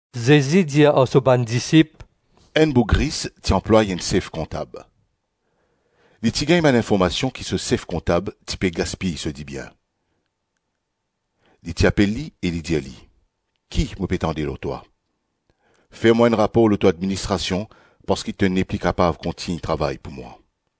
Zezi dir ar so bann disip, “Enn boug ris ti anplway enn sef kontab. Li ti gagn bann informasion ki so sef kontab ti pe gaspiy so dibien. Li ti apel li e li ti dir li, ‘Ki mo pe tande lor twa? Fer mwa enn rapor lor to administrasion parski to nepli kapav kontign travay pou mwa.’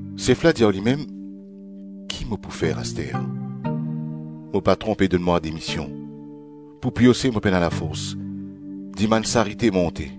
Sef la dir ar limem, ‘Ki mo pou fer aster? Mo patron pe donn mwa demision. Pou piose mo pena lafors, dimann sarite mo onte.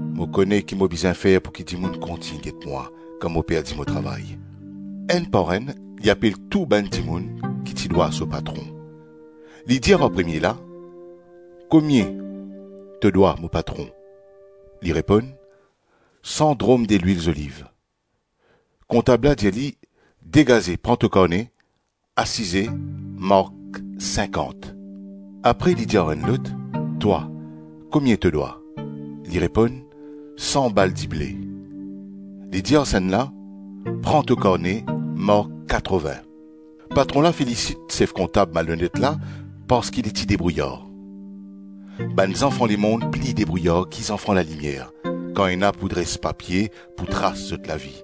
Mo kone ki mo bizin fer pouki dimoun kontign get mwa kan mo perdi mo travay.’ Enn par enn, li apel tou bann dimoun ki ti dwa so patron. Li dir ar premie la, ‘Komie to dwa mo patron?’ Li reponn, ‘San drom delwil zoliv.’ Kontab la dir li, ‘Degaze pran to karne, asize, mark sinkant.’ Apre li dir ar enn lot, ‘Twa, komie to dwa?’ Li reponn, ‘San bal dible.’ Li dir ar sannla, ‘Pran to karne, mark katrovin.’ Patron la felisit sef kontab malonet la parski li ti debrouyar. Bann zanfan lemonn pli debrouyar ki zanfan lalimier kan ena pou dres papie pou tras zot lavi.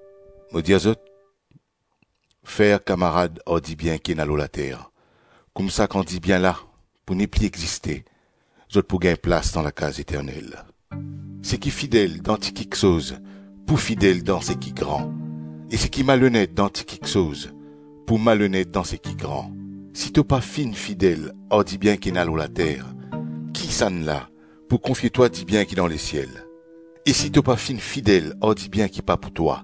Mo dir zot, fer kamarad ar dibien ki ena lor later, koumsa kan dibien la pou nepli existe, zot pou gagn plas dan lakaz eternel. Seki fidel dan ti kiksoz, pou fidel dan seki gran; e seki malonet dan ti kiksoz, pou malonet dan seki gran. Si to pa finn fidel ar dibien ki ena lor later, kisannla pou konfie twa dibien ki dan lesiel? E si to pa finn fidel ar dibien ki pa pou twa,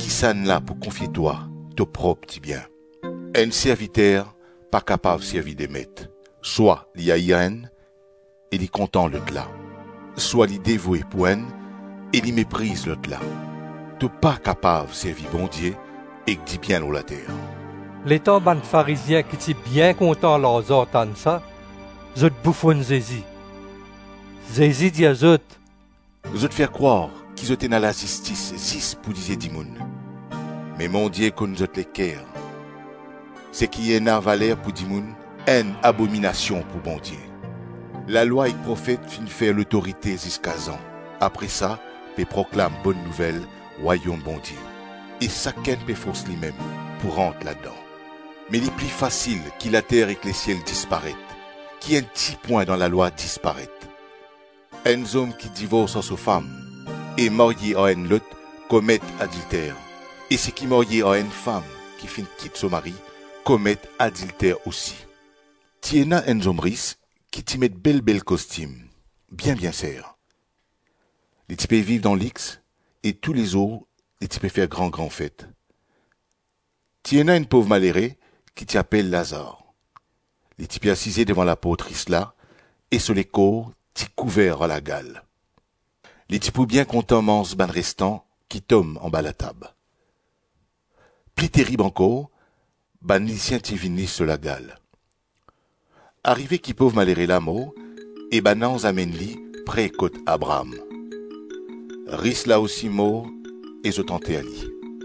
kisannla pou konfie twa to prop dibien? Enn serviter pa kapav servi de met; swa li air enn e li kontan lotla, swa li devoue pou enn e li mepriz lotla. To pa kapav servi Bondie ek dibien lor later.” Letan bann Farizien ki ti bien kontan larzan tann sa, zot boufonn Zezi. Zezi dir zot, “Zot fer krwar ki zot ena lazistis zis pou lizie dimoun, me Bondie konn zot leker. Seki ena valer pou dimoun, enn abominasion pou Bondie. Lalwa ek profet finn fer lotorite ziska Zan; apre sa, pe proklam Bonn Nouvel Rwayom Bondie e sakenn pe fors limem pou rant ladan. Me li pli fasil ki later ek lesiel disparet, ki enn ti pwin dan lalwa disparet. Enn zom ki divors ar so fam e marye ar enn lot, komet adilter e seki marye ar enn fam ki finn kit so mari, komet adilter osi. Ti ena enn zom ris, ki ti met bel-bel kostim, bien-bien ser. Li ti pe viv dan lix e toulezour li ti pe fer gran-gran fet. Ti ena enn pov malere ki ti apel Lazar. Li ti pe asize devan laport ris la, e so lekor ti kouver ar lagal. Li ti pou bien kontan manz bann restan ki tom anba latab. Pli terib ankor, bann lisien ti vinn lis so lagal. Arive ki pov malere la mor e bann anz amenn li pre kot Abraam. Ris la osi mor e zot anter li.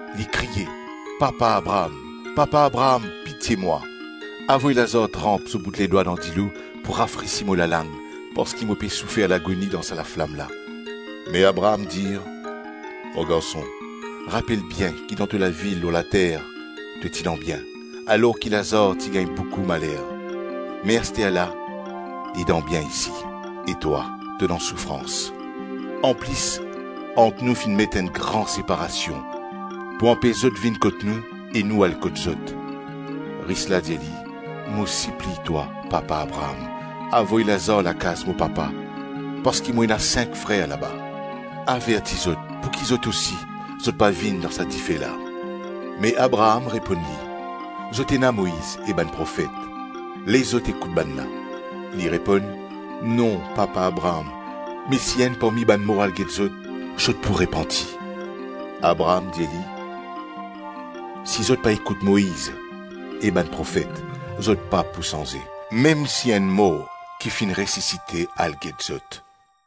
Li kriye, ‘Papa Abraam, papa Abraam, pitie mwa. Avoy Lazar tranp so bout ledwa dan dilo pou rafresi mo lalang parski mo pe soufer lagoni dan sa laflam la.’ Me Abraam dir, ‘Mo garson, rapel bien ki dan to lavi lor later to ti dan bien, alor ki Lazar ti gagn boukou maler; me asterla li dan bien isi, e twa to dan soufrans. Anplis, ant nou finn met enn gran separasion pou anpes zot vinn kot nou e nou al kot zot.’ Ris la dir li, ‘Mo sipliy twa, papa Abraam, avoy Lazar lakaz mo papa, parski mo ena sink frer laba. Averti zot pouki zot osi, zot pa vinn dan sa dife la.’ Me Abraam reponn li, ‘Zot ena Moiz e bann profet, les zot ekout bannla.’ Li reponn, ‘Non, papa Abraam, me si enn parmi bann mor al get zot, zot pou repanti.’ Abraam dir li, ‘Si zot pa ekout Moiz e bann profet, zot pa pou sanze, mem si enn mor ki finn resisite al get zot.’”